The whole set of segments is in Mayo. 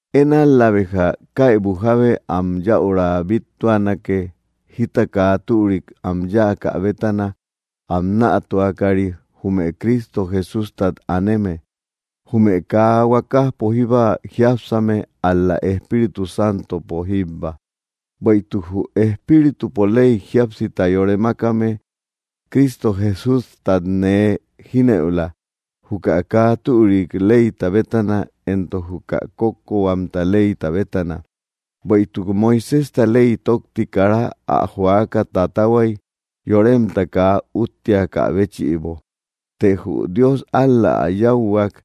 Én ál‑la béja, kaybu jábe am yäurau bíttuanake, jita kaa türik am yáakä bétana am nätuakari, jume Cristo Jesústat aneme, jume kaa huakajpo jíba jiápsame, ál‑la Espíritu Santopo jíbba. Bueïtuk jü Espíritupo ley jíapsita yore mákame Cristo Jesústat nee jínëula, juka kaa türik leyta bétana entok juka kókkohuam leyta bétana. Bueïtuk Moiséjta ley tókti kara ä joaka tatahuay, yoremta kaa úttiakä béchïbo. Të jü Dios ál‑la ä yáuhuak;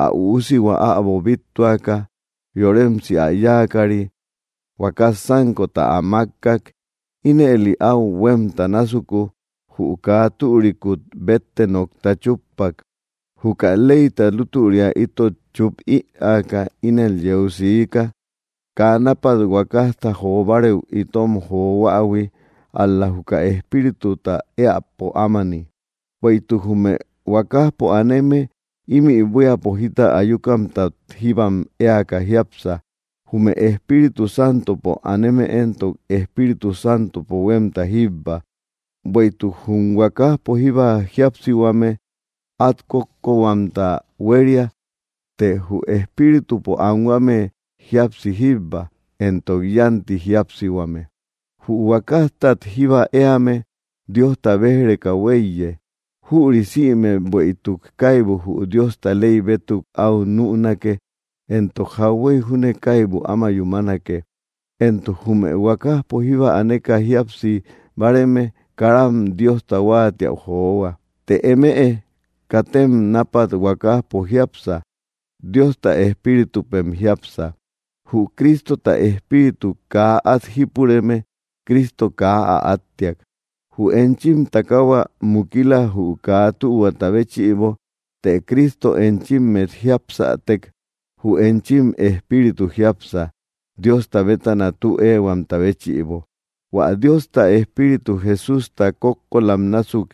ä Üusihua äbo bíttuaka, yoremsi ä yáakari huakas sánkota ä mákkak. Ínëli áu huémta násuku, jü kaa türikut bétte nokta chúppak. Juka leyta lútüria itot chúp ïaaka ínel yeu siika, kaa nápat huakajta jo barëu itom johuähui, ál‑la juka Espírituta éäpo ámani. Bueïtuk jume huakajpo aneme ímï buíapo jita ayukamtat jíbam éaka jiápsa; jume Espíritu Santopo aneme éntok, Espíritu Santopo huémta jíbba. Bueïtuk jum huakajpo jíba jíapsihuame át kókkohuamta huéria; të jü Espíritupo anhuame jíapsi jíbba, entok yánti jíapsihuame. Jü huakajtat jíba éame Diosta béj‑reka huéiye. Jüri sïme, bueïtuk kaibu jü Diosta ley bétuk äu nünake, entok jauhuey júne kaibu áma yúmanake; entok jume huakajpo jíba aneka jíapsi báareme karam Diosta huáatiäu johua. Të eme katem nápat huakajpo jiápsa; Diosta Espíritupem jiápsa. Jü Cristota Espíritu kaa at jípureme, Cristo kaa ä áttiak. Jü enchim takahua mukila, jü kaa tühuata béchïbo; të Cristo enchimmet jíapsätek, jü enchim espíritu jiápsa Diosta bétana tü éehuamta béchïbo. Huä Diosta Espíritu Jesústa kókkolam násuk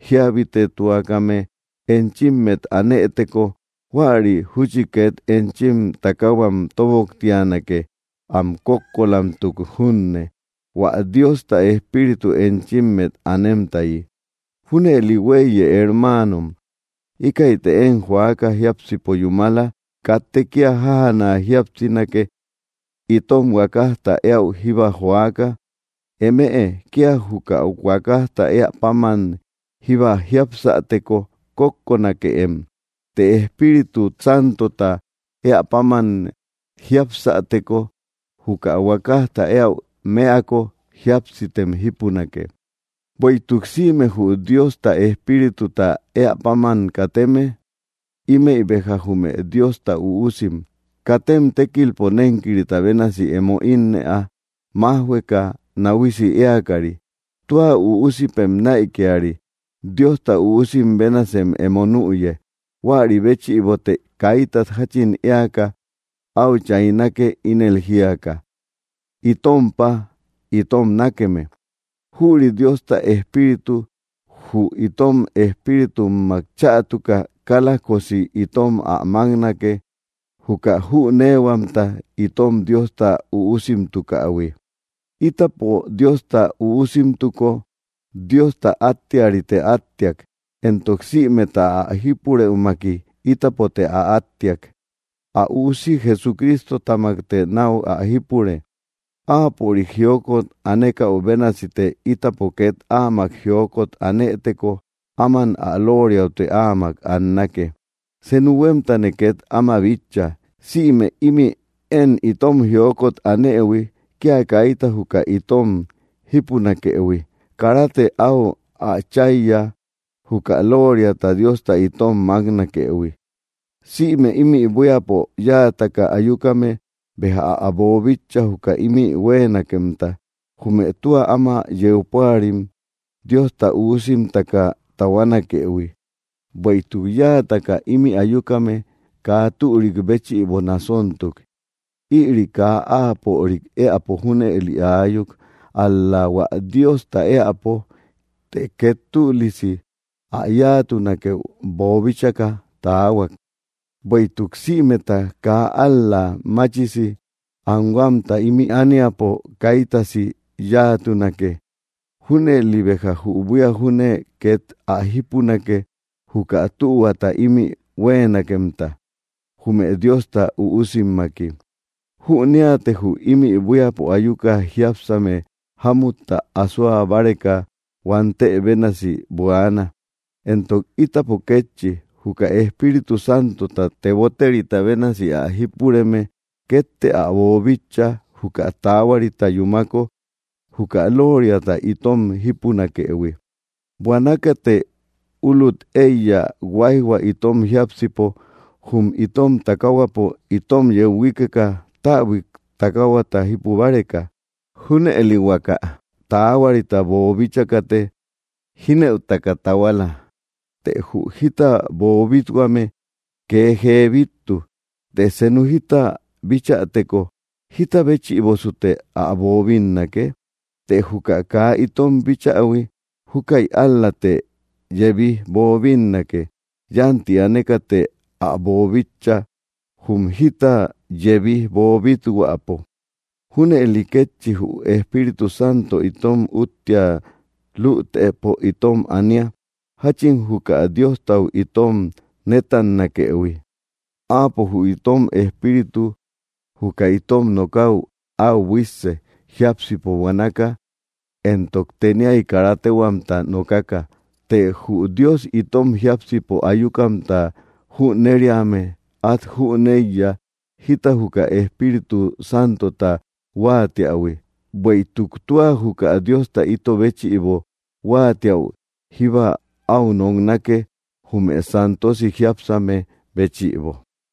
jíabitetuakame enchimmet anëteko, huäri júchi két enchim takahuam tóboktianake, am kókkolamtuk junne, hua Diosta Espíritu enchimmet anemtayi. Junëli huéiye, hermaanom, íkäite én joaka jiápsipo yúmala; katte kía jájana jíapsinake, itom huakajta éäu jíba joaka. Eme kía juka huakajta éä páman jíba jiapsäteko, kókkonakeem. Të Espíritut Santota éä páman jiapsäteko, juka huakajta éäu mëako, jíapsitem jípunake. Bueïtuk sïme jü Diosta Espírituta eä páman kateme, ímëi béja jume Diosta üusim. Katem tékilpo nénkirita bénasi emo ínnëa, májhueka náhuisi éakari. Tua üusipem näikiari, Diosta üusim bénasem emo nüye. Huäri béchïbote kaitat jáchin éaka áu chaynake, ínel jíaka: “Itom Páa, itom nákeme.” Jüri Diosta Espíritu jü itom espíritummak chätuka kálajkosi itom ä máknake, juka jüneehuamta itom Diosta üusimtukähui. Ítapo Diosta üusimtuko, Diosta áttearite átteak; entok sïmeta ä jípurëumaki ítapote ä átteak. Ä Üusi Jesucristotamakte náu ä jípure. Áapörik jiokot anekaü bénasite ítapo két áamak jiokot anëteko, áman ä lóoriaute áamak annake. Senu huémtane két áma bitcha: sïme ímï én itom jiokot anëhui kia kaita juka itom jípunakëhui, karate áu ä cháiya, juka lóoriata Diosta itom máknakëhui. Sïme ímï buíapo yáataka ayukame béja ä boobíchaïhui, juka ímï huéenakemta, jume tua áma yeu púarim Diosta üusimtaka tahuanakëhui. Bueïtuk yáataka ímï ayukame kaa türik béchïbo nasontuk; ïri kaa áapörik éäpo junëli aayuk, ál‑la hua Diosta éäpo, të két tülisi ä yáatunakeu boobíchaka taahuak, bueïtuk sïmeta kaa ál‑la machisi anhuamta ímï ániapo kaitasi yáatunake; junëli béja jü buía júne két ä jípunake, juka tühuata ímï huéenakemta, jume Diosta üusimmaki. Jüneate jü ímï buíapo ayuka jiápsame jámutta asoa báreka huantë bénasi buaana; entok ítapo kétchi, juka Espíritu Santota teboterita bénasi ä jípureme, kétte ä boobíchaïhui, juka taahuarita yúmako juka lóoriata itom jípunakëhui, buanakate ulut éiya huáijhua itom jiápsipo, jum itom takaahuapo itom yeu huíkeka, täbui takaahuata jípu báreka. Júnëli huaka taahuarita boobíchakate jínëutaka tahuala. Të jü jita boobit-huame kee jee bíttu. Të senu jita bítchäteko, ¿jita béchïbosute ä boobinnake? Të juka kaa itom bíchähui, júkäi ál‑late yebij boobinnake; yánti anekate ä bobitcha, jum jita yebij boobít-huäpo. Júnëli kétchi jü Espíritu Santo itom úttia lütëpo itom ania; jáchin juka Diostau itom nétannakëhui, áapo jü itom espíritu juka itom nokäu áu buísse, jiápsipo buanaka entok teniai kara téhuatumta nokaka. Të jü Dios itom jiápsipo ayukamta jüneriame át jüneiya jita juka Espíritu Santota huáatiähui, bueïtuk tua juka Diosta ito béchïbo huáatiäu jíba áu noknake, jume santosi jiápsame béchïbo.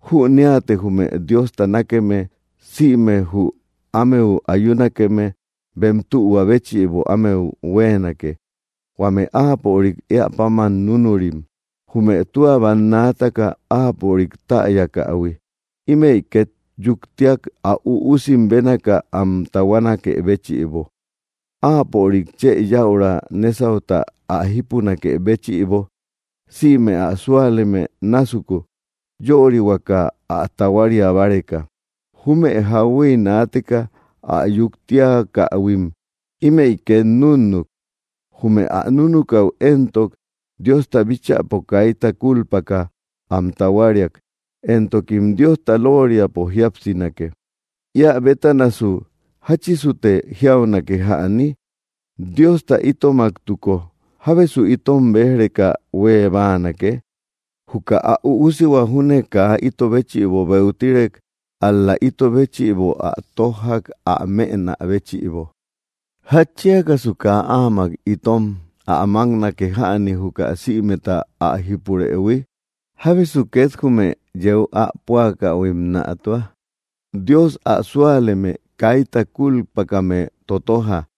Jüneate jume Diosta nákeme, sïme jü ámeu ayunakeme bem tühua béchïbo ámeu huéenake, huame áapörik éä páman núnurim. Jume tua bannaataka Áapörik täyakähui, ímëi két yuktiak, ä Üusi bénaaka am tahuanakë béchïbo, Áapörik chë yaura nesauta ä jipunakë béchïbo, sïme ä súaleme násuku. Yörihuakä ä tahuaria báreka. Jume jauhuey naateka ä yuktiakähuim, ímëi két núnnuk. Jume ä núnukaü éntok, Diosta bíchäpo kaita kulpaka am tahuariak, entokim Diosta lóoriapo jiasinake. Ía bétanasu, ¿jáchisute jiaunake jäni? Diosta itomaktuko, ¿jábesu itom béj‑reka huée báanake? Juka ä Üusihua júne kaa ito béchïbo beutirek, ál‑la ito béchïbo ä tójjak ä mënä béchïbo. ¿Jatchiakasu kaa áamak itom ä máknake jäni, juka sïmeta ä jipurëhui? ¿Jábesu két jume yeu ä púakähuim nätua? Dios ä súaleme kaita kúlpakame tóttoja.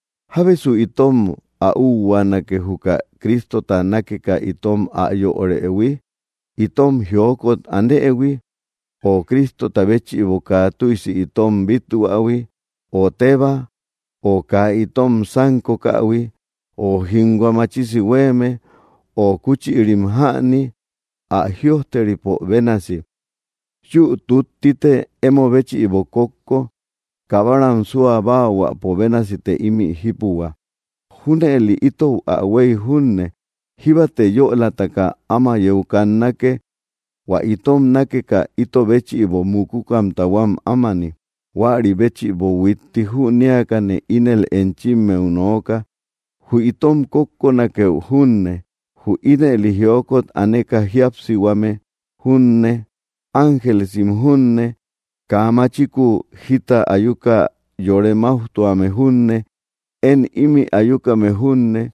¿Jábesu itom ä úhuaanake, juka Cristota nákeka itom ä yörëhui? ¿Itom jiokot anëhui, ö Cristota béchïbo kaa tüisi itom bíthuähui, ö tébaa, ö kaa itom sánkokähui, ö jínhua machisi huéeme, ö kúchïrim jäni? Ä jïojteripo bénasi: Yü túttite emo béchïbo kókko; kabaram súa báahuäpo bénasite ímï jípuhua. Júnëli itou ä huéy junne, jíbate yölataka áma yeu kannake, hua itom nákeka ito béchïbo mukukamta huam ámani. Huäri béchïbo huitti jünéakane ínel enchimmeu nooka: Jü itom kókkonakeu junne, jü ínëli jiokot aneka jíapsihuame junne, ángelesim junne, kaa machikuu jita ayuka yore máujtuame junne, én ímï ayukame junne,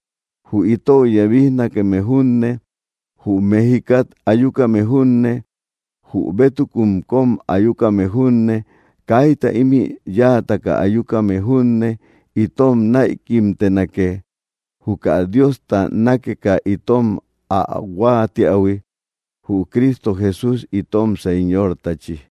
jü itou yebijnakeme junne, jü met jikat ayukame junne, jü bétukun kóm ayukame junne, kaita ímï yáataka ayukame junne itom näikimtenake, juka Diosta nákeka itom ä huáatiähui, jü Cristo Jesús itom Señortachi.